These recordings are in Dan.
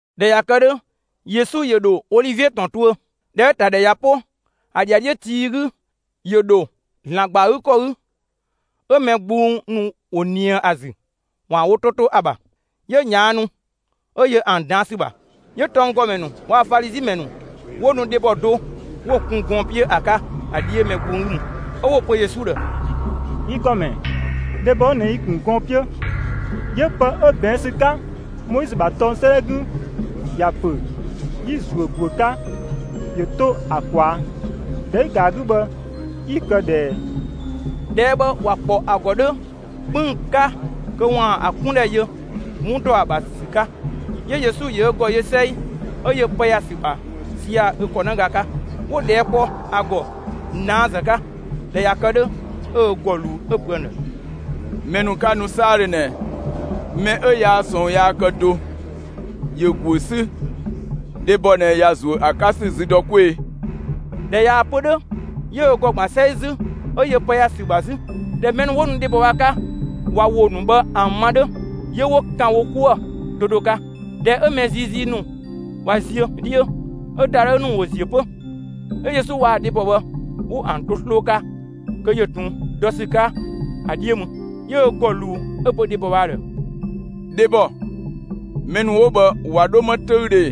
[꞊Dhɛ ꞊ya kë 'dhö, Yesu ‑yö ‑dho Olivie ‑tɔn tuö. ꞊Dhɛ 'ö‑ ‑ta ‑dhɛ ꞊ya 'po, ‑a ‑dhiadhiö tii 'gü, ‑yö ‑dho ‑Zlan ‑gba ‑a 'gü ‑kɔ 'gü, 'ö mɛ gbung ‑nu ‑wo ꞊nië ‑a ‑zü (‑waan wo 'to to ‑a ‑bha). 'Yö ꞊yaannu, 'ö yö ‑an ꞊daan' ‑sü ‑bha. 'Yö tɔnggɔmɛ ‑nu waa‑ Falizi ‑mɛ ‑nu 'wo nu dhebɔ do 'wo‑ kun gɔɔn‑ 'piö ‑a 'ka ‑a 'dhiö mɛ gbung 'gü mü. 'Ö 'wo‑ pö Yesu ‑dhë: «Yi ‑Gɔmɛ, dhebɔ 'ö ꞊nɛ yi‑ ‑kun gɔɔn‑ 'piö. 'Yö pë 'ö ꞊bɛɛn' ‑sü 'ka Moizö ‑bha tɔng 'sëëdhɛ 'gü ‑ya ‑pö 'yi‑ ‑zuö ‑guö 'ka ‑yö 'to ‑a ꞊kwaa'. ‑Dhɛ 'ü‑ ‑ga ‑a 'gü bhë, 'yi‑ kë ꞊dhë ꞊ɛɛ?» ꞊Dhɛɛ' bhë ‑wa ‑kpɔ ‑a ‑gɔ 'dhö 'kpënng‑ 'ka, kö ‑waan ‑a 'kundhɛ yö 'wun dɔ ‑a ‑bha ‑sü 'ka. 'Yö Yesu ‑yö ö ‑gɔ yö 'sɛi, 'ö yö pë ‑ya ‑sü ‑bha 'sia‑ ö ‑kɔnëga 'ka. 'Wo ꞊dhɛɛ' kpɔ ‑a ‑gɔ ꞊naazë 'ka. ꞊Dhɛ ꞊ya kë 'dhö, 'ö ö ‑gɔ ꞊luu 'ö‑ pö ‑an ‑dhë: «Mɛ ‑nu 'ka nu 'saadhö ꞊nɛ, mɛ 'ö yaa ꞊sɔɔn yaa kë do, ‑yö ‑guö 'sü, dhebɔ ꞊nɛ ‑ya ‑zuö dɔ ‑a 'ka ‑sü zü dɔ 'kwee‑!» ꞊Dhɛ ꞊yaa‑ pö 'dhö, 'yö ö ‑gɔ ‑gban 'sɛi 'zü, 'ö yö pë ‑ya ‑sü ‑bha 'zü. ꞊Dhɛ mɛ ‑nu 'wo nu dhebɔ bhë ‑a 'ka, ꞊wa ‑wo ‑nu bhë ‑an ma 'dhö, 'yö 'wo ‑kan wo 'kuë‑ do do 'ka. ꞊Dhɛ 'ö mɛ ziizii ‑nu ꞊wa ziö 'dhiö, 'ö ‑dadhëü ‑nu ‑wo ‑ziö 'pö; 'ö Yesu waa‑ dhebɔ bhë, 'wo ‑an to 'sloo 'ka, kö yö ꞊tun dɔ ‑sü 'ka ‑a 'dhiö mü. 'Yö ö ‑gɔ ꞊luu 'ö‑ pö dhebɔ bhë ‑a ‑dhë: «Dhebɔ, mɛ ‑nu 'wo bhë ꞊wa 'dho 'më 'töüdhö ꞊ee?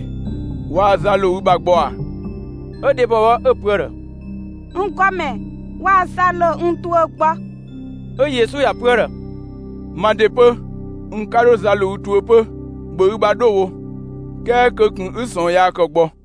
Waa za ‑lo ü ‑bha gbɔ ꞊a?» 'Ö dhebɔ bhë 'ö‑ pö ‑a ‑dhë: «N ‑Gɔmɛ, waa za ‑lo n tuö gbɔ.» 'Ö Yesu ‑ya pö ‑a ‑dhë: «Ma ‑de 'pö, n 'ka 'dho za ‑lo ü tuö 'pö; ‑bhö ü ‑bha 'dho wo; 'kɛɛ kö ꞊kun 'ü ꞊sɔɔn yaa ‑kë gbɔ.»]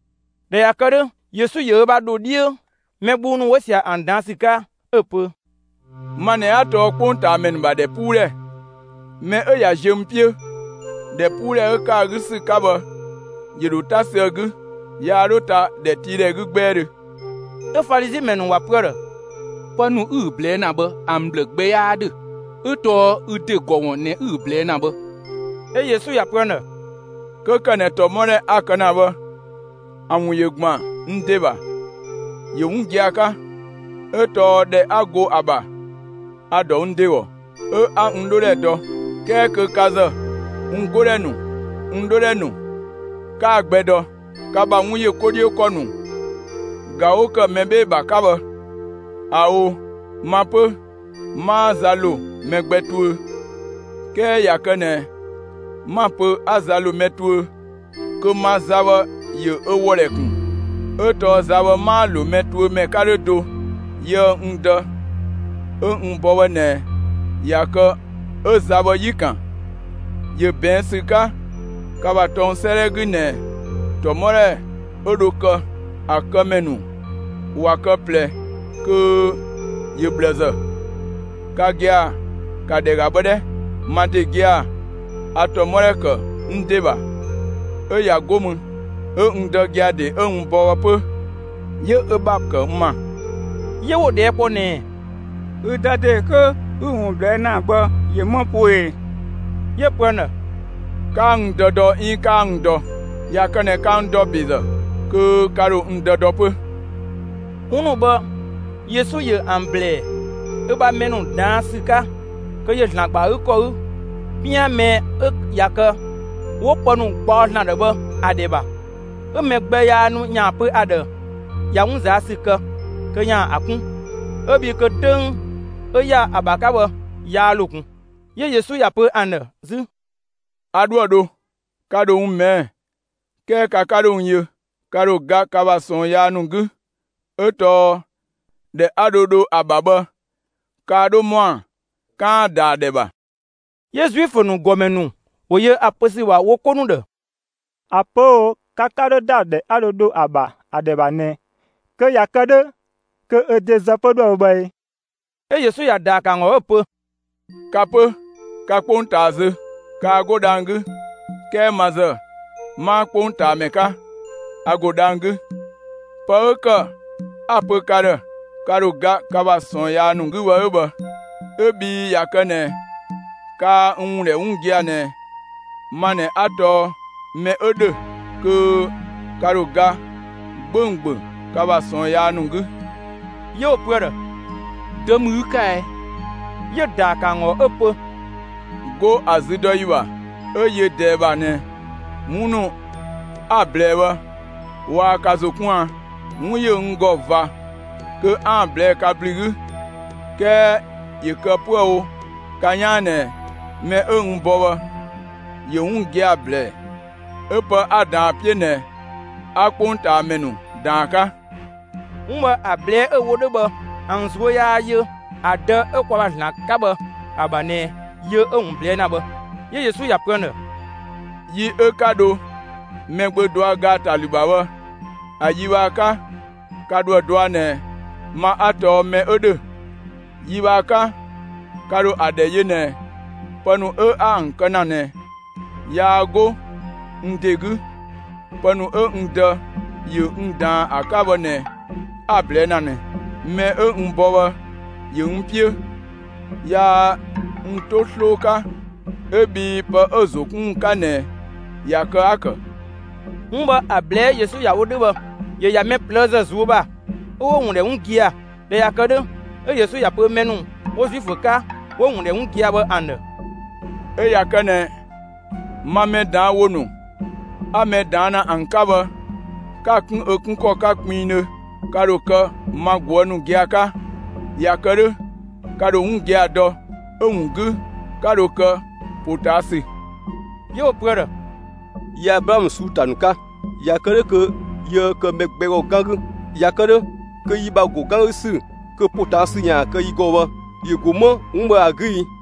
꞊Dhɛ ꞊ya kë 'dhö, Yesu ‑yö ö ‑bha ‑dho 'dhiö mɛ gbung ‑nu 'wo ꞊sia bhë ‑an ꞊daan' ‑sü 'ka, 'ö‑ pö: «Ma ꞊nɛ 'a tɔɔ 'kpongtaamɛ ‑nu ‑bha ‑dhɛpuudhɛ; mɛ 'ö ꞊ya ziö n 'piö, ‑dhɛpuudhɛ 'ö ‑kë ‑a 'gü ‑sü 'ka bhë, ‑yö ‑dho 'ta sü ‑a 'gü; yaa 'dho ta ‑dhɛtiidhɛ 'gü 'gbɛɛdhö.» 'Ö Falizi ‑mɛ ‑nu ‑wa pö ‑a ‑dhë: «Pë ‑nu 'ü‑ ꞊blɛɛ' ‑na bhë, ‑an ꞊bhlë gbɛ 'yaa 'dhö 'ö tɔɔ ü ‑de ‑gɔ ‑wun ꞊nɛ 'ü‑ ꞊blɛɛ' ‑na bhë.» 'Ö Yesu ‑ya pö ‑an ‑dhë: «'Kö ‑kë ꞊nɛ ‑tɔmɔdhɛ 'a‑ kë ‑na bhë, ‑a ‑wun ‑yö ‑gban n ‑de ‑bha, ‑yö 'wun gia‑ 'ka, 'ö tɔɔ ‑dhɛ 'a go ‑a ‑bha, a‑ ‑dɔ n ‑de ‑gɔ, 'ö 'a n 'dhodhɛ dɔ; 'kɛɛ kö ka ‑zë, n 'godhɛ ‑nu, n 'dhodhɛ ‑nu 'kaa‑ gbɛ dɔ. Ka ‑bha 'wun ‑yö 'ko 'dhiö ‑kɔ ‑nu ꞊ga 'wo ‑kë mɛ 'bhee‑ ‑bha 'ka bhë! ꞊Ao', ma 'pö 'maa za ‑lo mɛ gbɛ tuö. 'Kɛɛ ꞊ya kë ꞊nɛ 'ma‑ pö 'a za ‑lo mɛ tuö, kö ma za bhë ‑yö ö ‑wɔdhɛ ‑kun, 'ö tɔɔ za bhë 'maa‑ ‑lo mɛ tuö ‑mɛ 'ka 'dhö do. Yië‑ n Dë 'ö n bɔ bhë ꞊nɛ ꞊ya kë 'ö za bhë 'yi‑ ‑kan. ‑Yö ꞊bɛɛn' ‑sü 'ka ka ‑bha tɔng 'sëëdhɛ 'gü ꞊nɛ ‑tɔmɔdhɛ 'ö dho kë, ‑a kë ‑mɛ ‑nu ꞊wa kë ꞊plɛ kö ‑yö ꞊bhlëzë. Ka gia‑, ‑ka ‑dhɛ ‑ga bhë 'dhɛ! Ma ‑de gia‑, a ‑tɔmɔdhɛ ‑kë n ‑de ‑bha, 'ö ꞊ya 'go mü 'ö n Dë gia‑ ‑de 'ö n bɔ bhë 'pö, 'yö ö ‑bha ‑kë n ‑ma.» 'Yö 'wo‑ ꞊dhɛɛ' kpɔ ꞊nɛɛ: «Ü dë ‑de 'kö ('ü‑ ‑wun ꞊blɛɛ' ‑na) bhë, ‑yö 'më poo ꞊ee?» 'Yö‑ pö ‑an ‑dhë: «'Kaa n Dë dɔ 'iin 'kaa n dɔ. ꞊Ya kë ꞊nɛ ka n ‑dɔ ‑bezë kö ka ‑dho n Dë dɔ 'pö.» 'Wun ‑nu bhë Yesu ‑yö ‑an ‑blɛɛ ö ‑bha mɛ ‑nu ꞊daan' ‑sü 'ka kö ‑yö ‑Zlan ‑gba ‑a 'gü ‑kɔ 'gü, 'pian mɛ 'ö ꞊ya kë 'wo pë ‑nu gbaɔ ‑Zlan ‑dhë bhë ‑a ‑dhɛ ‑bha. 'Ö mɛ gbɛ yaa nu ‑yaan (pö ‑a ‑dhë ꞊ya 'wun ꞊zaa' ‑sü kë kö ‑yaan) ‑a 'kun, 'ö bhii kö 'töng 'ö ‑ya ‑a ‑bha 'ka bhë yaa ‑lo ꞊kun. 'Yö Yesu ‑ya pö ‑an ‑dhë 'zü: «A 'dhoë‑ dho; ka ‑dho n ꞊mɛɛ'‑ 'kɛɛ ka 'ka 'dho n yö; ka ‑dho ga ka ‑bha ꞊sɔɔn yaa ‑nu 'gü, 'ö tɔɔ ‑dhɛ 'a dho dho ‑a ‑bha bhë, kaa 'dho ‑mɔa 'kaan‑ ‑da ‑a ‑dhɛ ‑bha.» 'Yö Zuifö ‑nu ‑gɔmɛ ‑nu ‑wo yö ‑a pö ‑sü ‑bha wo 'ko ‑nu ‑dhë: «‑A pö 'ö‑ wo ‹ka 'ka 'dho ‑da ‑dhɛ 'a dho dho ‑a ‑bha bhë ‑a ‑dhɛ ‑bha› ꞊nɛ kö ꞊ya kë 'dhö kö ö ‑de zë 'pö dhoë‑ wo bhë ee?» 'Ö Yesu ‑ya ‑daa ‑kë ‑an ‑gɔ, 'ö‑ pö: «Ka 'pö, ka 'kpongtaa zö, kaa 'go dhang‑ 'gü; 'kɛɛ ma ‑zë, 'maa 'kpongtaamɛ 'ka, a ‑go dhang‑ 'gü. Pë 'ö ‑kë 'a‑ pö ka ‑dhë, ka ‑dho ga ka ‑bha ꞊sɔɔn yaa ‑nu 'gü bhë 'ö bhë; 'ö bhii ꞊ya kë ꞊nɛ kaa‑ ‑wun ‑dhɛ 'wun gia‑ ꞊nɛ ma ꞊nɛ 'a tɔɔ ‹mɛ 'ö ‑dhö›, kö ka ‑dho ga 'gbönggböng ka ‑bha ꞊sɔɔn yaa ‑nu 'gü.» 'Yö 'wo‑ pö ‑a ‑dhë: «Dö ‑mü ü 'ka ɛɛ?» 'Yö‑ ‑daa ‑kë ‑an ‑gɔ 'ö‑ pö: «'Go ‑a züdɔyi ‑bha 'ö yö ꞊dɛɛ ‑bha ꞊nɛ, 'wun ‑nu 'a‑ ꞊blɛɛ bhë, waa ka ‑zo 'kun a? 'Wun ‑yö n ‑gɔ ꞊va kö 'aan‑ ꞊blɛɛ'‑ ka ‑blü 'gü. 'Kɛɛ ‑yö kë 'püë‑ wo ka 'yaan ꞊nɛ mɛ 'ö n bɔ bhë ‑yö 'wun gia‑ ‑blɛɛ; 'ö pë 'a‑ ꞊daan ‑a 'piö ꞊nɛ 'a 'kpongtaamɛ ‑nu ꞊daan ‑a 'ka.» 'Wun bhë ‑a ꞊blɛɛ'‑ 'ö‑ wo 'dhö bhë, ‑an ꞊zuö' yaa yö ‑a Dë 'ö kwa ‑bha ‑Zlan 'ka bhë ‑a ‑bha ꞊nɛ yö 'ö‑ ‑wun ꞊blɛɛ' ‑na bhë. 'Yö Yesu ‑ya pö ‑an ‑dhë: «Yi 'ö 'ka dho Mɛgbö dɔa ‑gaatalü ‑bha bhë, ‑a yi bhë ‑a 'ka ka ‑dho ‑a dɔa ꞊nɛ ma 'a tɔɔ ‹mɛ 'ö ‑dhö›; yi bhë ‑a 'ka, ka ‑dho ‑a ‑dhɛ yö ꞊nɛ pë ‑nu 'a ‑an kë ‑na ꞊nɛ, yaa 'go n ‑de 'gü. Pë ‑nu 'ö n Dë ‑yö n ꞊daan ‑a 'ka bhë ꞊nɛ 'a‑ ꞊blɛɛ' ‑na ꞊nɛ. Mɛ 'ö n bɔ bhë ‑yö n 'piö. Yaa n 'to 'sloo 'ka 'ö bhii pë 'ö‑ ‑zo 'kun ‑wun 'ka ꞊nɛ ꞊ya kë 'a‑ ‑kë.» 'Wun bhë ‑a ꞊blɛɛ'‑ 'ö Yesu ‑ya wo 'dhö bhë, ‑yö ‑ya mɛ ꞊plëëzë ꞊zuö' ‑bha 'ö 'wo‑ ‑wun ‑dhɛ 'wun gia‑. ꞊Dhɛ ꞊ya kë 'dhö, 'ö Yesu ‑ya pö mɛ ‑nu 'wo Zuifö 'ka 'wo‑ ‑wun ‑dhɛ 'wun gia‑ bhë ‑an ‑dhë: «'Ö ꞊ya kë ꞊nɛ ma mɛ ꞊daan' ‑wo ‑nu 'a mɛ ꞊daan' ‑na ‑an 'ka bhë, 'ka‑ 'kun ö 'kun ‑kɔ 'ka kpinngdhö, ka ‑dho kë ma ꞊guë' ‑nu gia‑ 'ka; ꞊ya kë 'dhö, ka ‑dho 'wun gia‑ dɔ; 'ö‑ ‑wun 'gü, 'ka dho kë ‑potaasü.» 'Yö 'wo‑ pö ‑a ‑dhë: «Yi Ablaamö ꞊suu'‑ ‑ta ‑nu 'ka; ꞊ya kë 'dhö kö yiëë kë do mɛ gbɛ ‑gɔ 'gan 'gü. ꞊Ya kë 'dhö kö yi ‑bha ‑go 'gan 'gü ‑sü kö ‑potaasü ‑yaan kë yi ‑gɔ bhë ‑yö ‑go 'më 'wun bhë ‑a 'gü ii?»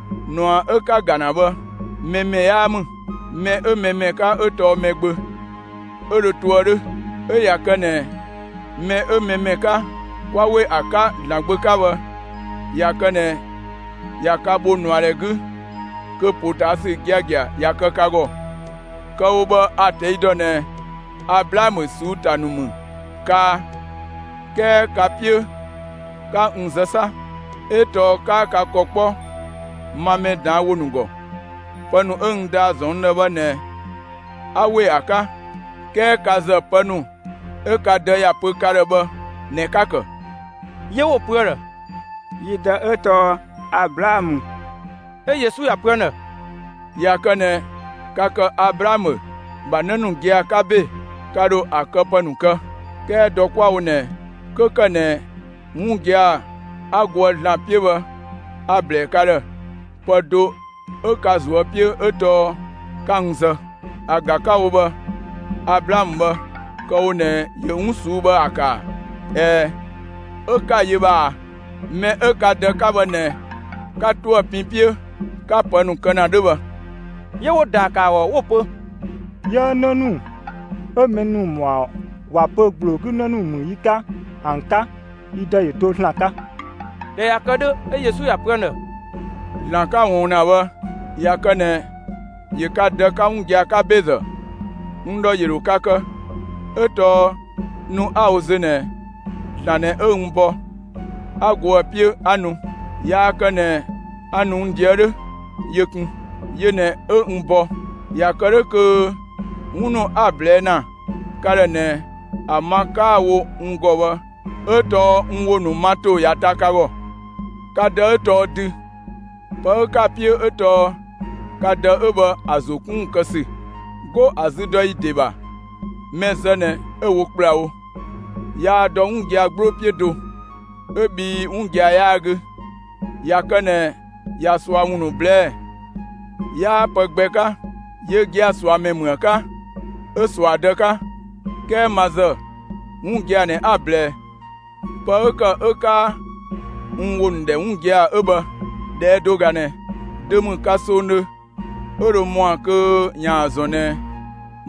꞊Nua 'ö 'ka‑ ‑ga ‑na bhë, mɛ ‑mɛ 'yaa ‑mü. Mɛ 'ö mɛ ‑mɛ 'ka 'ö tɔɔ Mɛgbö; 'ö dho toë 'dhö. 'Ö ꞊ya kë ꞊nɛ mɛ 'ö mɛ ‑mɛ 'ka, 'kwa ‑we ‑a 'ka ‑Zlan Gbö 'ka bhë, ꞊ya kë ꞊nɛ ꞊ya ka bho ꞊nuadhɛ 'gü, kö ‑potaasü giagia ꞊ya kë ka ‑gɔ. Kë‑ wo bhë a‑ ꞊tɛi' ‑dɔ ꞊nɛ Ablaamö ꞊suu'‑ ‑ta ‑nu ‑mü kaa. 'Kɛɛ ka‑ 'piö 'ka n zë 'sa! 'Ö tɔɔ 'kaa ka ‑kɔ 'kpɔ ma mɛ ꞊daan' ‑wo ‑nu ‑gɔ. Pë ‑nu 'ö n Dë ‑ya ‑zɔn n ‑dhë bhë ꞊nɛ 'a ‑we ‑a 'ka; 'kɛɛ ka ‑zë, pë ‑nu 'ö ka dë ‑ya pö ka ‑dhë bhë ꞊nɛ 'ka‑ ‑kë.» 'Yö 'wo‑ pö ‑a ‑dhë: «Yi dë 'ö tɔɔ Ablaamö.» 'Ö Yesu ‑ya pö ‑an ‑dhë: «꞊Ya kë ꞊nɛ ka ‑kë Ablaamö ‑bha 'në ‑nu gia‑ 'ka ‑be, ka ‑dho ‑a këpë ‑nu kë. 'Kɛɛ dɔ 'kwa‑ wo ꞊nɛ, 'kö ‑kë ꞊nɛ 'wun gia‑ 'a goë ‑Zlan 'piö bhë a‑ ‑blɛɛ ka ‑dhë, pë do 'ö ka ꞊zuö' 'piö 'ö tɔɔ 'ka n zë. ‑A ꞊ga 'ka‑ wo bhë, Ablaamö bhë, kë‑ wo ꞊nɛ ‑yö 'wun ꞊suu'‑ bhë ‑a ‑kë ‑a? ꞊Ɛɛ, 'ö 'ka‑ ‑yö bhë ꞊a! Mɛ 'ö ka dë 'ka bhë ꞊nɛ 'ka 'to ‑a pin 'piö, 'ka pë ‑nu kë ‑na 'dhö bhë.» 'Yö 'wo‑ ‑daa ‑kë ‑a ‑gɔ 'wo‑ pö: «'Yiëë 'në ‑nu 'ö mɛ ‑nu ‑wo ‑mɔa ‑wa pö ‑gbloo 'gü ‑në ‑nu ‑mü yi 'ka ‑an 'ka; yi dë ‑yö do ‑Zlan 'ka.» ꞊Dhɛ ꞊ya kë 'dhö, 'ö Yesu ‑ya pö ‑an ‑dhë: «‑Zlan 'ka‑ ꞊wɔɔn ‑na bhë, ꞊ya kë ꞊nɛ ‑yö ka dë 'ka 'wun gia‑ 'ka ‑bezë, n ‑dhɔ ‑yö ‑dho ka kë, 'ö tɔɔ nu 'a‑ wo zö ꞊nɛ, ‑Zlan ꞊nɛ 'ö n bɔ, 'a go ‑a 'piö 'a nu; yaa kë ꞊nɛ a ‑nu n ꞊deë' 'dhö, yö kun; yö ꞊nɛ 'ö n bɔ. ꞊Ya kë 'dhö kö 'wun ‑nu 'a‑ ꞊blɛɛ' ‑na ka ‑dhë ꞊nɛ ‑a ma 'kaa‑ wo n ‑gɔ bhë 'ö tɔɔ n ‑wo ‑nu ma ‑to ꞊ya ta ka ‑gɔ. Ka dë 'ö tɔɔ dü. Pë 'ö 'ka‑ 'piö 'ö tɔɔ ka dë 'ö bhë ‑a ‑zo 'kun ‑wun kë ‑sü. 'Go ‑a züdɔyi ‑de ‑bha, mɛ zë ꞊nɛ 'ö‑ wo ‑kplawo. Yaa dɔ 'wun gia‑ 'gbloo 'piö do, 'ö bhii 'wun gia‑ 'yaa‑ 'gü. ꞊Ya kë ꞊nɛ ꞊ya ꞊sua ‑wun ‑nu ꞊blɛɛ', 'yaa pë gbɛ 'ka yö ꞊ga ꞊suamɛ ‑mü ‑a 'ka, 'ö ꞊sua dë 'ka. 'Kɛɛ ma ‑zë, 'wun gia‑ ꞊nɛ 'a‑ ꞊blɛɛ; pë 'ö ‑kë 'ö 'kaa n ‑wo ‑nu ‑dhɛ 'wun gia‑ 'ö bhë. ꞊Dhɛɛ' do ꞊ga ꞊nɛ: Dö ‑mü ka songdhö 'ö dho ‑mɔa kö ‑yaan ‑zɔn ꞊nɛ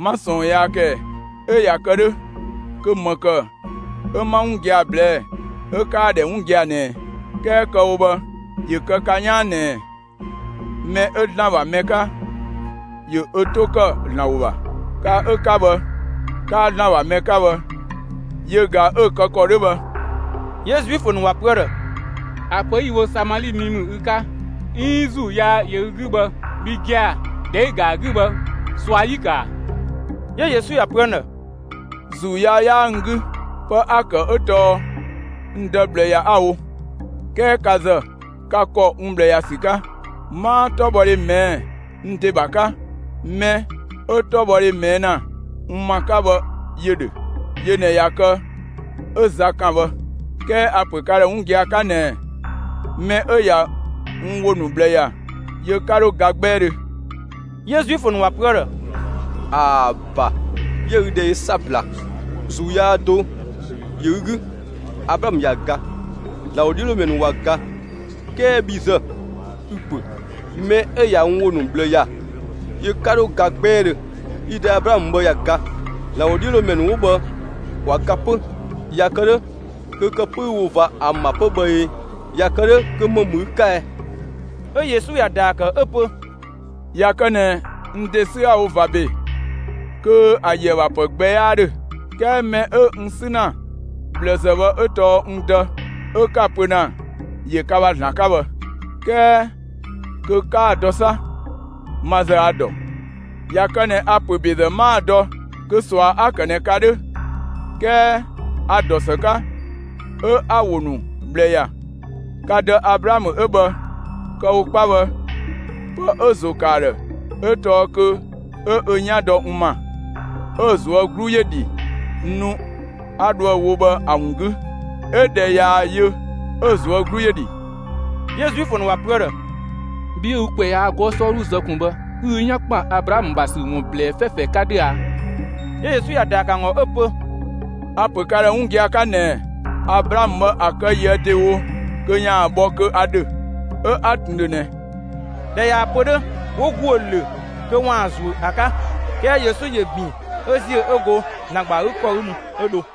'ma ꞊sɔɔn yaa kë ꞊ɛɛ? 'Ö ꞊ya kë 'dhö kö ‑më ‑kë 'ö 'ma 'wun gia‑ ꞊blɛɛ'‑, 'ö 'kaa‑ ‑dhɛ 'wun gia‑ ꞊nɛɛ? 'Kɛɛ kë‑ wo bhë ‑yö kë ka 'yaan ꞊nɛɛ: Mɛ 'ö ‑Zlan ‑bha mɛ 'ka, ‑yö ö 'to ‑kë ‑Zlan ‑wo ‑bha. Ka 'ö 'ka bhë, 'kaa ‑Zlan ‑bha mɛ 'ka bhë yö ꞊ga 'ö‑ kë ‑kɔ 'dhö bhë.» 'Yö Zuifö ‑nu ‑wa pö ‑a ‑dhë: «‑A pö 'yi‑ wo Samali mi ‑mü ü 'ka, 'iin 'ö ‑zuu yaa ‑yö ü 'gü bhë, bhi gia‑, ‑dhɛ 'ü‑ ‑ga ‑a 'gü bhë, ꞊sua 'yi‑ ‑kë ‑a?» 'Yö Yesu ‑ya pö ‑an ‑dhë: «‑Zuu yaa 'yaa n 'gü. Pë 'a‑ ‑kë 'ö tɔɔ n Dë ꞊bhlë ‑ya 'a‑ wo; 'kɛɛ ka ‑zë, ka ‑kɔ n ꞊bhlë ‑ya ‑sü 'ka. 'Maa 'tɔbhɔdhe ꞊mɛɛ'‑ n ‑de ‑bha 'ka; mɛ 'ö 'tɔbhɔdhe ꞊mɛɛ' ‑na n ‑ma 'ka bhë ‑yö ‑dhö. Yö ꞊nɛ ꞊ya kë 'ö za kan bhë. 'Kɛɛ a‑ ‑pö ka ‑dhë 'wun gia‑ 'ka ꞊nɛɛ: Mɛ 'ö ꞊ya n ‑wo ‑nu ꞊bhlë ‑ya, yö 'ka 'dho ga 'gbɛɛdhö.» 'Yö Zuifö ‑nu ‑wa pö ‑a ‑dhë: «‑Aa ‑ba, 'yië ü ‑dhɛ yö 'sabla! ‑Zuu yaa do ‑yö ü 'gü! Ablaamö ꞊ya ga; ‑Zlan ‑wodhiölomɛ ‑nu ꞊wa ga; 'kɛɛ bhi ‑zë, ü‑ pö: ‹Mɛ 'ö ꞊ya n ‑wo ‑nu ꞊bhlë ‑ya, yö 'ka 'dho ga 'gbɛɛdhö.› Yi dë Ablaamö bhë ꞊ya ga; ‑Zlan ‑wodhiölomɛ ‑nu 'wo bhë ꞊wa ga 'pö. ꞊Ya kë 'dhö kö kë 'pö 'ü‑ wo ꞊va ‑an ‑bha 'pö bhë ee? ꞊Ya kë 'dhö kö ‑më ‑mü ü 'ka ɛ?» 'Ö Yesu ‑ya ‑daa ‑kë 'ö‑ pö: «꞊Ya kë ꞊nɛ n ‑de 'sü 'a‑ wo ꞊va ‑be, kö ‑a ‑yöë ‑pë gbɛ 'yaa ‑dhö. 'Kɛɛ mɛ 'ö n 'sü ‑na ꞊bhlëzë bhë 'ö tɔɔ n Dë 'ö 'ka‑ pö ‑na ‑yö ka ‑bha ‑Zlan 'ka bhë. 'Kɛɛ kö 'kaa‑ dɔ 'sa! Ma ‑zë a‑ ‑dɔ. ꞊Ya kë ꞊nɛ a‑ ‑pö ‑bezë 'maa‑ dɔ kö ꞊sua 'a‑ ‑kë ꞊nɛ ka 'dhö. 'Kɛɛ a‑ ‑dɔ ‑së 'ka, 'ö 'a‑ ‑wo ‑nu ꞊bhlë ‑ya. Ka dë Ablaamö 'ö bhë, kë‑ wo 'kpa bhë, pë 'ö‑ ‑zo ‑kë ‑a ‑dhë 'ö tɔɔ kö 'ö ö 'yan dɔ n ‑ma. 'Ö‑ ꞊zuö' 'glu ‑yö dhi nu 'a dho ‑a wo bhë ‑a ‑wun 'gü; 'ö ꞊dhɛ ꞊yaa‑ yö 'ö‑ ꞊zuö' 'glu ‑yö ‑dhi.» 'Yö Zuifö ‑nu ‑wa pö ‑a ‑dhë: «Bhi 'ö ü ‑kwɛ yaa 'gɔɔ‑ 'sɔɔdhuzë ꞊kun bhë, 'ü ü 'yan ‑kpën Ablaamö ‑bha ‑sü ‑wun ꞊blɛɛ 'fɛfɛ 'ka 'dhö a?» 'Yö Yesu ‑ya ‑daa ‑kë ‑an ‑gɔ 'ö‑ pö: «A‑ ‑pö ka ‑dhë 'wun gia‑ 'ka ꞊nɛɛ: Ablaamö bhë ‑a kë ꞊yië' ‑dewo kö ‑yaan bhɔ kö a ‑dhö, 'ö 'a ꞊tun ‑dhö ꞊nɛ.» ꞊Dhɛ ꞊yaa‑ pö 'dhö, 'wo ‑guö ‑lö kö ‑waan ‑a ‑zuö ‑a 'ka. 'Kɛɛ Yesu ‑yö ‑bin 'ö ‑ziö 'ö go ‑Zlan ‑gba ‑a 'gü ‑kɔ mü 'ö dho.